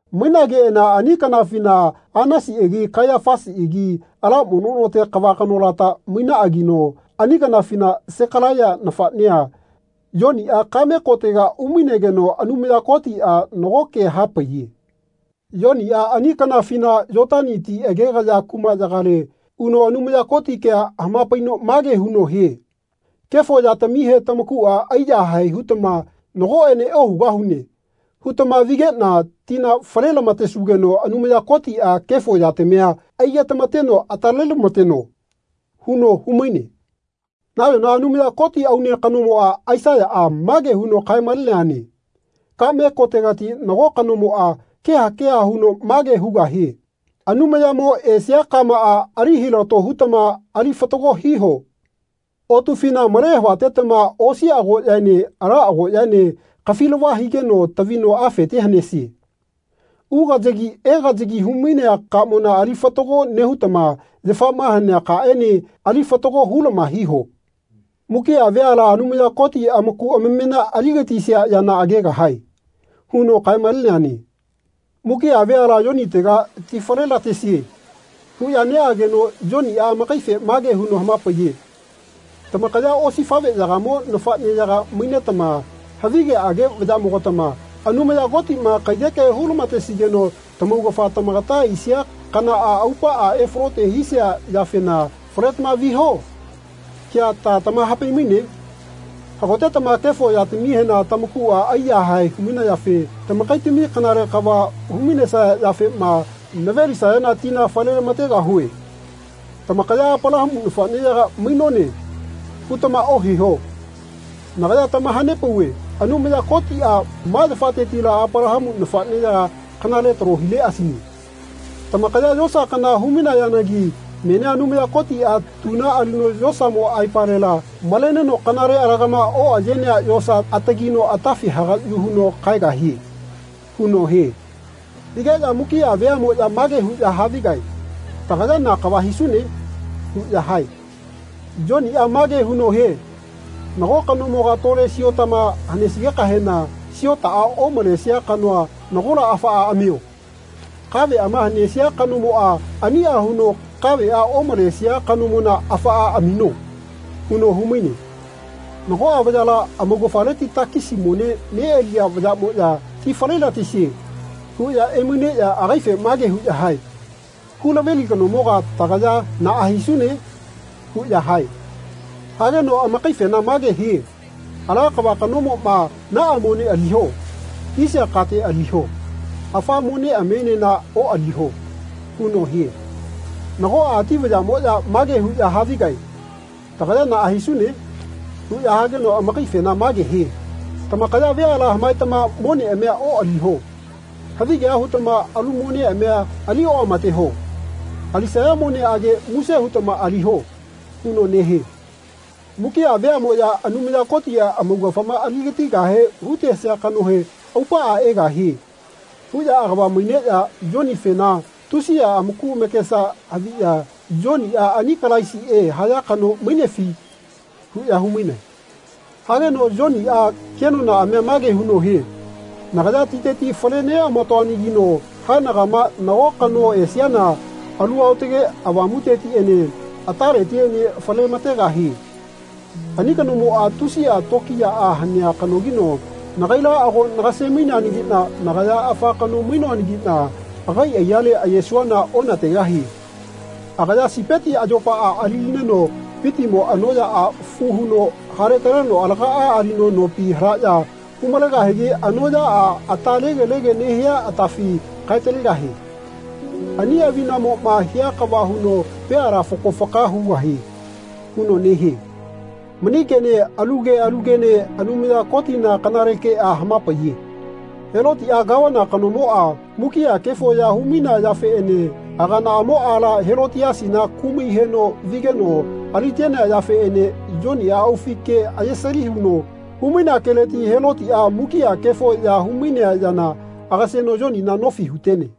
Mainageꞌana ani kanafina Anasiꞌagi Kaiyafasiꞌagi ala mono note kava kanolata mainaꞌanagino ani kanafina Sekalaiya nafaꞌnea, Yoniꞌa kaꞌme kotega umainegeno Anumaya Kotiꞌa nago ke hapaiye. Yoniꞌa ani kanafina Yotani ti agegaya kumaꞌyagale uno Anumaya Koti kea hamapaino mage huno hie “Kefo yatamihe tamakuꞌa aiyahae hutama ‘Nagoꞌene ohugahune.’ hutama vigeꞌna tina falelamatesugeno Anumaya Kotiꞌa kefo yatamia aigetamateno atalelamateno.” huno humaine. Nayona Anumaya Koti aune kanomoꞌa, Aisaiyaꞌa, mage huno kaemaleneane “Kaꞌme kotegati nago kanomoꞌa keha keha huno mage hugahie ‘Anumayamo esia kamaꞌa ali hilato hutama ali fatago hiho. Otufina male havatetama osi agoꞌyaene ala agoꞌyaene kafilava higeno tavino afete hanesie. Ugayagi egayagi humainea kamona ali fatago nehutama yafama hanea kaꞌene ali fatago hulama hiho. Mukiꞌa veala Anumaya Koti amaku amamena aligatisia yana agegahae.’ huno kaemaleneane.” Mukiꞌa veala Yonitega “Ti falelatesie.” huꞌya neꞌageno Yoniꞌa amakaife mage huno hamapaiye “Tamakaya osifaꞌveyagamo nafaꞌneyaga mainetama, havigeꞌage vayaꞌmogatama, Anumaya Kotiꞌma kaiyeke hulamatesigeno tamaugafa tamagata aisia kanaꞌa aupaꞌa efalote hisia yafena ‘Faletama viho.’ kea ta tamahapaimaine? Hagotetama kefo yatamihena tamakuꞌa aiyahae humainayafe tamakaitami kanale kava humainesaya yafema navelisayana tina falelamategahue. Tamakaya ‘Apalahamu nafaꞌneyaga mainone.’ hutama ohiho. Nagaya tamahanepauve Anumaya Kotiꞌa ma yafatetila Apalahamu nafaꞌneyaga kanale talo hileꞌasine. Tamakaya yosa kana humainayanagi menia Anumaya Kotiꞌa tuna alino yosamo aipalela maleneno kanale alagama oꞌayenea yosa atagino atafi hagaꞌyu huno kaegahie.” huno hie. Higeꞌya mukiꞌa veaꞌmoꞌya mage huꞌya havigae “Tagaya na kava hisune?” huꞌya hae. Yoniꞌa mage huno hie “Nago kanomoga tole siotama hanesigekahena siotaꞌa omalesia kanoa nagola afaꞌa amio. Kaveꞌama hanesia kanomoꞌa aniꞌa huno kaveꞌa omalesia kanomona afaꞌa amino.” huno humaine. Nagoꞌa vayala amaugafaleti takisi mone neꞌaliya vayaꞌmoꞌya “Ti falelatesie.” huꞌya emaineꞌya agaife mage huꞌya hae “Hulaveli kanomoga tagaya naꞌa hisune?” huꞌya hae. Hageno amakaifena mage hie “Ala kava kanomoꞌma ‘Naꞌa mone aliho.’ hisia kate aliho. Afa moneꞌamienena oꞌaliho.” huno hie. Nagoꞌa ati vayaꞌmoꞌya mage huꞌya havigae “Tagaya naꞌa hisune?” huꞌya hageno amakaifena mage hie “Tamakaya veala hamaetama moneꞌamia oꞌaliho. Havigea hutama alu moneꞌamia ali oꞌamateho. Alisaya moneꞌage muse hutama aliho.” huno nehie. Mukiꞌa veaꞌmoꞌya Anumaya Kotiꞌa amaugafama aligatigahe hutesia kanohe “Aupaꞌa egahie.” huꞌya agava maineꞌya Yonifena tusiꞌa amaku amakesa haviꞌya “Yoniꞌa ani Kalaisiꞌe haya kano mainefi?” huꞌya humainae. Hageno Yoniꞌa kenonaꞌamia mage huno hie “Nagaya titeti fale nelamatoanagino haenagama nago kano esiana Alu Aotage Avamutetiꞌene ataletiꞌene falelamategahie. Ani kanomoꞌa tusiꞌa tokiyaꞌa hanea kanogino nagaila ago nagasemaineanagiꞌna nagaya afa kano mainoanagiꞌna agai aiyale ayesuana onategahie. Agaya sipeti ayopaꞌa alilineno vitimo anoꞌyaꞌa fu huno haletaleno alagaꞌa alino nopi halaꞌya humalegahigi anoꞌyaꞌa ata tegelege nehia atafi kaetalegahie. Ani avinamoꞌma hia kava huno veala fako faka hugahie.” huno nehie. Mani kene alu ke alu kene Anumaya Kotina kanale keꞌa hamapaiye. Helotiꞌa Gavana kanomoꞌa mukiꞌa kefo ya humainea yafeꞌene aganaꞌamo aala Helotiasina kumai heno vigeno alitenea yafeꞌene Yoniꞌa aufi ke ayesali huno humainea keleti Helotiꞌa mukiꞌa kefo ya humainea yana agaseno Yonina nofi hutene.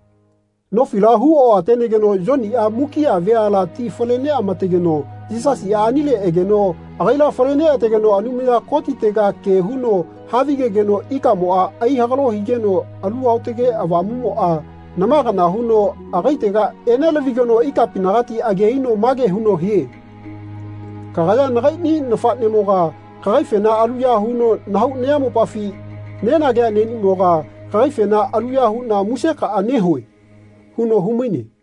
Nofila hu oꞌatenegeno Yoniꞌa mukiꞌa veala tina fale neꞌamategeno Yisasiꞌa anile egeno agaila fale neꞌategeno Anumaya Kotitega ke huno havigegeno ikamoꞌa aihagalo higeno Alu Aotage Avamuꞌmoꞌa nama kana huno agaitega enelavigeno ikapinagati age aino mage huno hie “Kagaya nagaiꞌni nafaꞌnemoga kagaifena aluya huno nahau nayamopafi nenagea neꞌnimoga kagaifena aluya huꞌna musekaꞌa nehue.” huno humaine.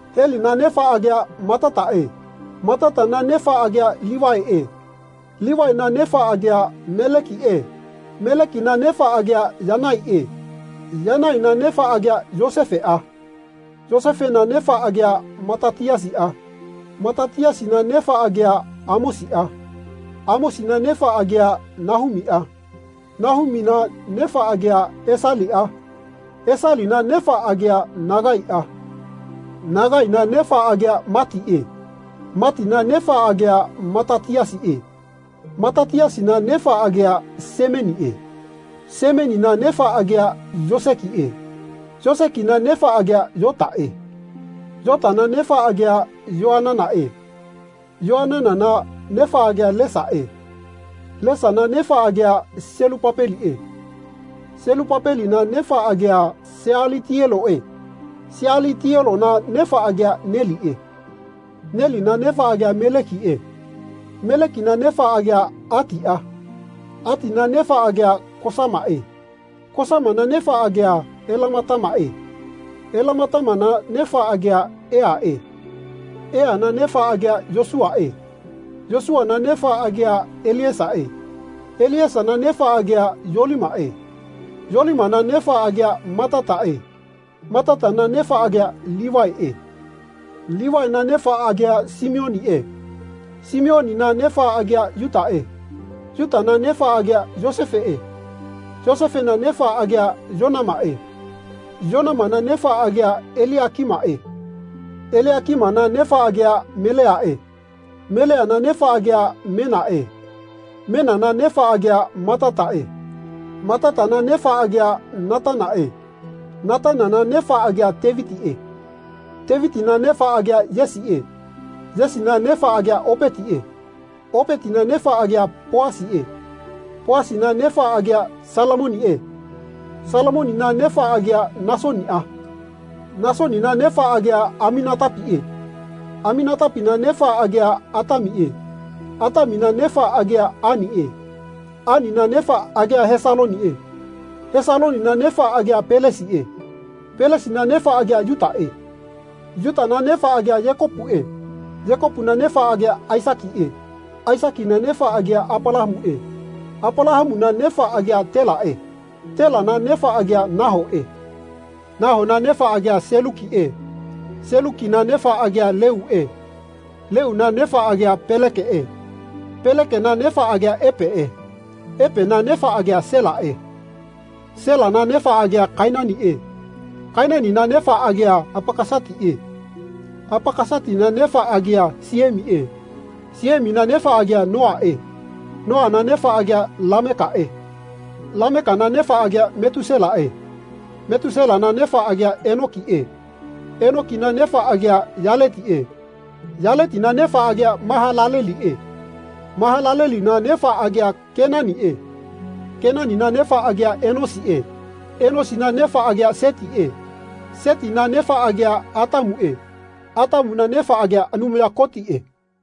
Helina nefa agia Matataꞌe. Matatana nefa agia Livaiꞌe. Livaina nefa agia Melekiꞌe. Melekina nefa agia Yanaiꞌe. Yanaina nefa agia Yosefeꞌa. Yosefena nefa agia Matatiasiꞌa. Matatiasina nefa agia Amosiꞌa. Amosina nefa agia Nahumiꞌa. Nahumina nefa agia Esaliꞌa. Esalina nefa agia Nagaiꞌa. Nagaina nefa agia Matiꞌe. Matina nefa agia Matatiasiꞌe. Matatiasina nefa agia Semeniꞌe. Semenina nefa agia Yosekiꞌe. Yosekina nefa agia Yotaꞌe. Yotana nefa agia Yoananaꞌe. Yoananana nefa agia Lesae. Lesana nefa agia Selupapeliꞌe. Selupapelina nefa agia Sealitieloꞌe. Sealitielona nefa agia Neliꞌe. Nelina nefa agia Melekiꞌe. Melekina nefa agia Atiꞌa. Atina nefa agia Kosamaꞌe. Kosamana nefa agia Elamatamaꞌe. Elamatamana nefa agia Eaꞌe. Eana nefa agia Yosuꞌae. Yosuꞌana nefa agia Eliesaꞌe. Eliesana nefa agia Yolimaꞌe. Yolimana nefa agia Matataꞌe. Matatana nefa agia Livaiꞌe. Livaina nefa agia Simioniꞌe. Simionina nefa agia Yutaꞌe. Yutana nefa agia Yosefeꞌe. Yosefena nefa agia Yonamaꞌe. Yonamana nefa agia Eliakimaꞌe. Eliakimana nefa agia Meleaꞌe. Meleana nefa agia Menaꞌe. Menana nefa agia Matataꞌe. Matatana nefa agia Natanaꞌe. Natanana nefa agia Tevitiꞌe. Tevitina nefa agia Yesiꞌe. Yesina nefa agia Opetiꞌe. Opetina nefa agia Poasiꞌe. Poasina nefa agia Salamoniꞌe. Salamonina nefa agia Nasoniꞌa. Nasonina nefa agia Aminatapiꞌe. Aminatapina nefa agia Atamiꞌe. Atamina nefa agia Aniꞌe. Anina nefa agia Hesaloniꞌe. Hesalonina nefa agia Pelesiꞌe. Pelesina nefa agia Yutaꞌe. Yutana nefa agia Yekopuꞌe. Yekopuna nefa agia Aisakiꞌe. Aisakina nefa agia Apalahamuꞌe. Apalahamuna nefa agia Telaꞌe. Telana nefa agia Nahoꞌe. Nahona nefa agia Selukiꞌe. Selukina nefa agia Leuꞌe. Leuna nefa agia Pelekeꞌe. Pelekena nefa agia Epeꞌe. Epena nefa agia Selaꞌe. Selana nefa agia Kainaniꞌe. Kainanina nefa agia Apakasatiꞌe. Apakasatina nefa agia Siemiꞌe. Siemina nefa agia Noaꞌe. Noana nefa agia Lamekaꞌe. Lamekana nefa agia Metuselaꞌe. Metuselana nefa agia Enokiꞌe. Enokina nefa agia Yaletiꞌe. Yaletina nefa agia Mahalaleliꞌe. Mahalalelina nefa agia Kenaniꞌe. Kenanina nefa agia Enosiꞌe. Enosina nefa agia Setiꞌe. Setina nefa agia Atamuꞌe. Atamuna nefa agia Anumaya Kotiꞌe.